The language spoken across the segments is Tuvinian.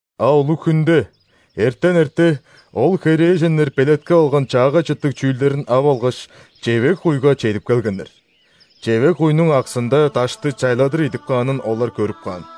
А улуг-хүнде, эртен эрте, ол херээженнер белеткеп алган чаагай чыттыг чүүлдерин ап алгаш, чевег-куйга чедип келгеннер. Чевег-куйнуң аксында дашты чайладыр идип каанын олар көрүп каан!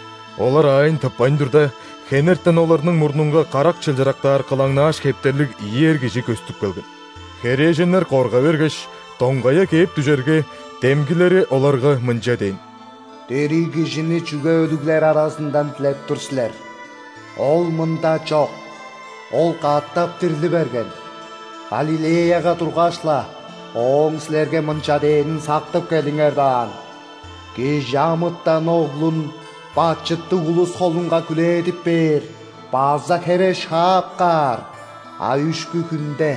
Олар аайын тыппайн турда, хенертен оларның мурнунга карак чылчырыктаар кылаңнааш хептерлиг ийи эр кижи көстүп келген. Херээженнер корга бергеш, доңгая кээп дүжерге, демгилери оларга мынча дээн: «Дириг Кижини чүге өлүглер аразындан дилеп тур силер? Ол мында чок: Ол катап дирли берген. Галилеяга тургаш-ла, Ооң силерге мынча дээнин сактып келиңер даан: „·Кижи амытан Оглун бачыттыг улус холунга хүлээдип бээр база хере шаап каар, а үшкү хүнде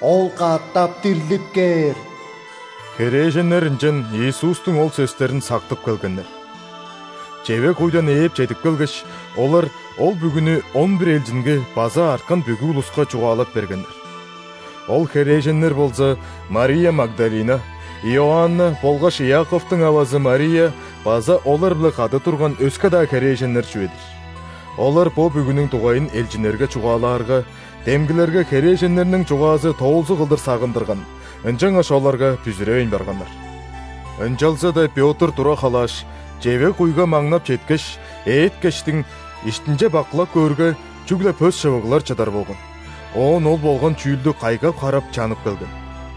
Ол катап дирлип кээр“». Херээженнер ынчан Иисустуң ол сөстерин сактып келгеннер. Чевег-куйдан ээп чедип келгеш, олар ол бүгүнү он бир элчинге база арткан бүгү улуска чугаалап бергеннер. Ол херээженнер болза Мария Магдалина, Иоанна болгаш Иаковтуң авазы Мария база олар-биле кады турган өске-даа херээженнер чүве-дир. Олар бо бүгүнүң дугайын элчиннерге чугаалаарга, демгилерге херээженнерниң чугаазы тоолзуг кылдыр сагындырган, ынчангаш оларга бүзүревейн барганнар. Ынчалза-даа Пётр тура халааш, чевег-куйга маңнап четкеш, ээккештиң, иштинче бакылап көөрге, чүгле пөс шывыглар чыдар болган. Оон ол болган чүүлдү кайгап-харап чанып келген.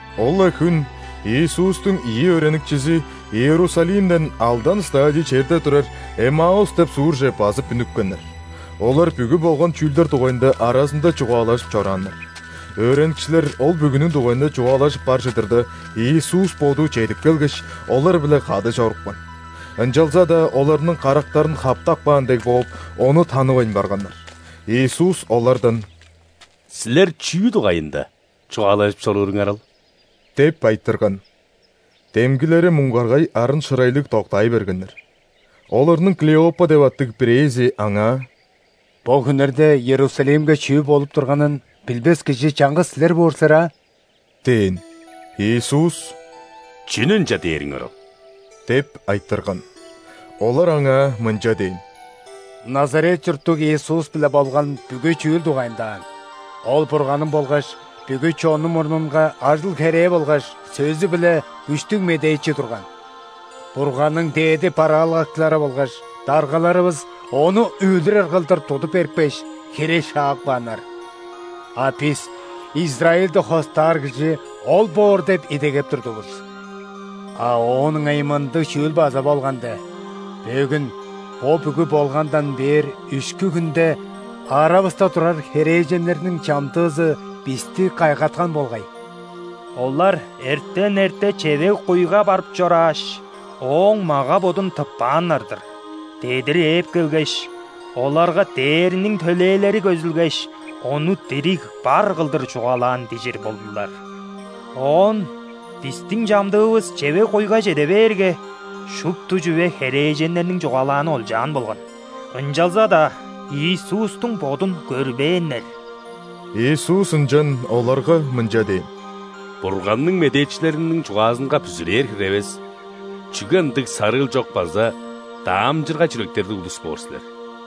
Ол-ла хүн Иисустуң ийи өөреникчизи Иерусалимден алдан °стадий черде турар Эммаус деп суурже базып үнүпкеннер. Олар бүгү болган чүүлдер дугайында аразында чугаалажып чорааннар. Өөреникчилер ол бүгүнүң дугайында чугаалажып бар чыдырда, Иисус Боду чедип келгеш, олар-биле кады чорупкан. Ынчалза-даа оларның карактарын хаптап каан дег бооп, Ону танывайн барганнар. Иисус олардан: «Силер чүү дугайында чугаалажып чорууруңар ол?» – деп айтырган. Демгилери муңгаргай арын-шырайлыг доктаай бергеннер. Оларның Клеопа деп аттыг бирээзи Аңаа: «Бо хүннерде Иерусалимге чүү болуп турганын билбес кижи чаңгыс силер боор силер аа?» – дээн. Иисус: «Чүнү ынча дээриңер ол?» – деп айтырган. Олар Аңаа мынча дээн: «Назарет чурттуг Иисус-биле болган бүгү чүүл дугайында аан. Ол Бурганның болгаш бүгү чоннуң мурнунга ажыл-херээ болгаш сөзү-биле күштүг медээчи турган. Бурганның дээди бараалгакчылары болгаш даргаларывыс Ону өлүрер кылдыр тудуп берипкеш, хере шаап кааннар. А бис Израильди хостаар кижи Ол боор деп идегеп турдувус. А оон ыңай мындыг чүүл база болган де: бөгүн, бо бүгү болгандан бээр үшкү хүнде, аравыста турар херээженнерниң чамдыызы бисти кайгаткан болгай. Олар эртен эрте чевег-куйга барып чорааш, Ооң мага-бодун тыппааннар-дыр. Дедир ээп келгеш, оларга ·дээрниң төлээлери көзүлгеш, Ону дириг бар кылдыр чугаалаан дижир болдулар. Оон бистиң чамдыывыс чевег-куйга чеде бээрге, шупту чүве херээженнерниң чугаалааны олчаан болган, ынчалза-даа Иисустуң Бодун көрбээннер». Иисус ынчан оларга мынча дээн: «Бурганның медээчилериниң чугаазынга бүзүрээр хире эвес, чүге ындыг сарыыл чок база даамчыргай чүректерлиг улус боор силер!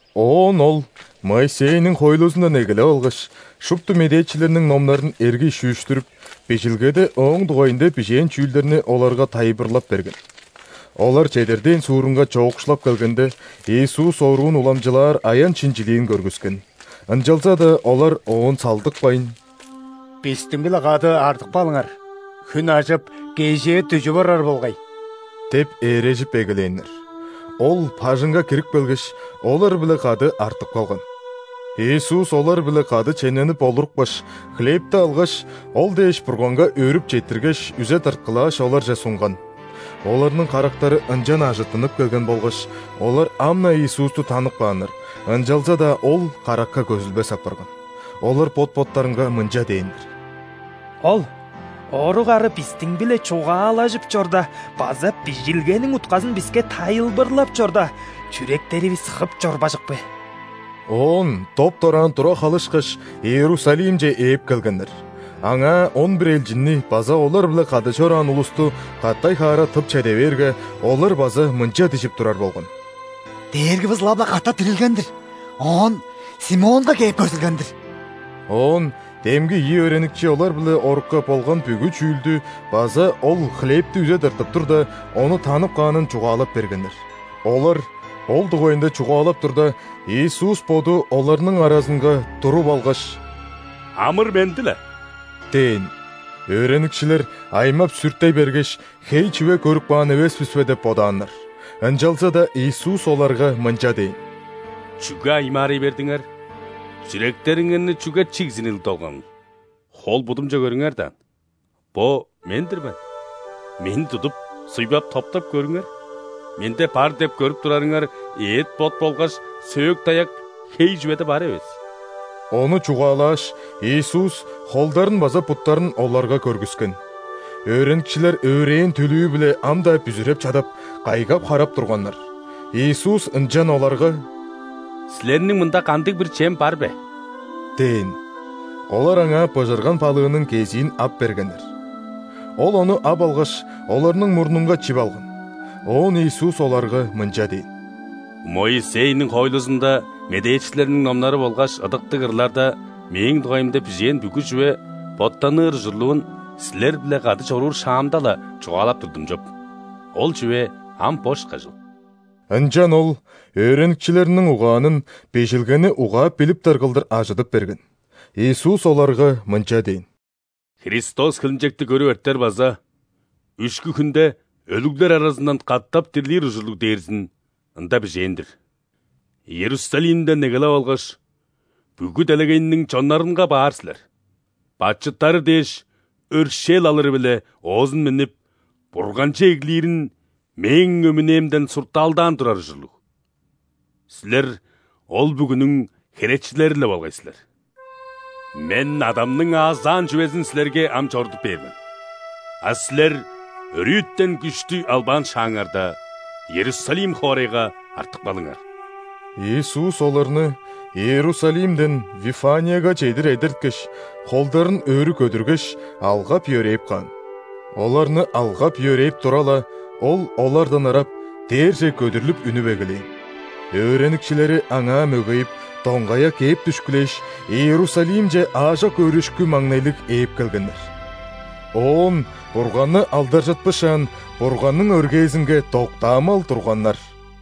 Оон Ол Моисейниң хоойлузундан эгелеп алгаш, шупту медээчилерниң номнарын эргий шүүштүрүп, Бижилгеде Ооң дугайында бижээн чүүлдерни оларга тайылбырлап берген. Олар чедер дээн суурунга чоокшулап келгенде, Иисус оруун уламчылаар аян-шинчилиин көргүскен. Ынчалза-даа олар Оон салдыкпайн: «Бистиң-биле кады артып калыңар, хүн ажып, кежээ дүжүп орар болгай» – деп ээрежип эгелээннер. Ол бажыңга кирип келгеш, олар-биле кады артып калган. Иисус олар-биле кады чемненип олурупкаш, хлебти алгаш, ол дээш Бурганга өөрүп четтиргеш, үзе тырткылааш, оларже сунган. Оларның карактары ынчан ажыттынып келген болгаш, олар ам-на Иисусту танып кааннар, ынчалза-даа Ол каракка көзүлбес апарган. Олар бот-боттарынга мынча дээннер: «Ол орук ара бистиң-биле чугаалажып чорда база Бижилгениң утказын биске тайылбырлап чорда, чүректеривис хып чорбажык бе?» Оон доп-дораан тура халышкаш, Иерусалимче ээп келгеннер. Аңаа он бир элчинни база олар-биле кады чораан улусту катай-хаара тып чеде бээрге, олар база мынча дижип турар болган: «Дээргивис ылап-ла катап дирилген-дир, оон Симонга кээп көзүлген-дир». Оон демги ийи өөреникчи олар-биле орукка болган бүгү чүүлдү база Ол хлебти үзе тыртып турда, Ону танып каанын чугаалап бергеннер. Олар ол дугайында чугаалап турда, Иисус Боду оларның аразынга туруп алгаш: «Амыр-менди-ле!» – дээн. Өөреникчилер аймап-сүртей бергеш, хей чүве көрүп каан эвес бис бе деп бодааннар. Ынчалза-даа Иисус оларга мынча дээн: «Чүге аймаарай бердиңер? Чүректериңерни чүге чигзиниг долганыл? Хол-будумче көрүңер даан, бо – Мен-дир мен. Мени тудуп суйбап, топтап көрүңер: Менде бар деп көрүп турарыңар эът-бот болгаш сөөк-даяк хей чүведе бар эвес». Ону чугаалааш, Иисус холдарын база буттарын оларга көргүскен. Өөреникчилер өөрээн түлүү-биле ам-даа бүзүреп чадап, кайгап-харап турганнар. Иисус ынчан оларга: «Силерниң мында кандыг-бир чем бар бе?» – дээн. Олар аңаа быжырган балыының кезиин ап бергеннер. Ол ону ап алгаш, оларның мурнунга чип алган. Оон Иисус оларга мынча дээн: «Моисейниң хоойлузунда, медээчилерниң номнары болгаш Ыдыктыг ырларда Мээң дугайымда бижээн бүгү чүве боттаныр ужурлуун силер-биле кады чоруур шаамда-ла чугаалап турдум чоп, ол чүве ам бо ышкажыл». Ынчан Ол өөреникчилериниң угаанын Бижилгени угаап билиптер кылдыр ажыдып берген. Иисус оларга мынча дээн: «Христос хилинчекти көрүп эртер база үшкү хүнде өлүглер аразындан катап дирлир ужурлуг дээрзин Ында бижээн-дир. Иерусалимден эгелеп алгаш, бүгү делегейниң чоннарынга баар силер, бачыттары дээш өршээл алыры-биле оозун миннип, Бурганче эглирин Мээң өмүнээмден суртаалдаан турар ужурлуг. Силер ол бүгүнүң херечилери-ле болгай силер. Мен Адамның аазаан чүвезин силерге ам чорудуп бээр мен. А силер өрүтен күштү албаан шааңарда, Иерусалим хоорайга артып калыңар». Иисус оларны Иерусалимден Вифанияга чедир эдерткеш, холдарын өрү көдүргеш, алгап-йөрээп каан. Оларны алгап-йөрээп тура-ла, Ол олардан ырап, дээрже көдүрлүп үнүп эгелээн. Өөреникчилери Аңаа мөгейип, доңгая кээп дүшкүлээш, Иерусалимче аажок өөрүшкү-маңнайлыг ээп келгеннер. Оон Бурганны алдаржытпышаан, Бурганның өргээзинге доктаамал турганнар.